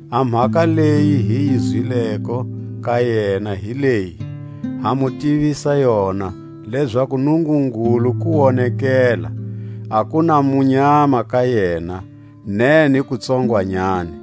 A mhaka leyi hi yi zwileko ka yena hi leyi, ha mu tivisa yona, lezaku Nungungulu kuwonekela, a ku na munyama ka yena, ne ni kutsongwanyani.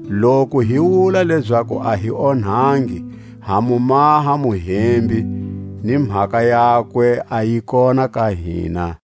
Loku hi wula lezaku a hi onhangi, ha mu maha muhembi, ni mhaka yakwe a yi kona ka hina.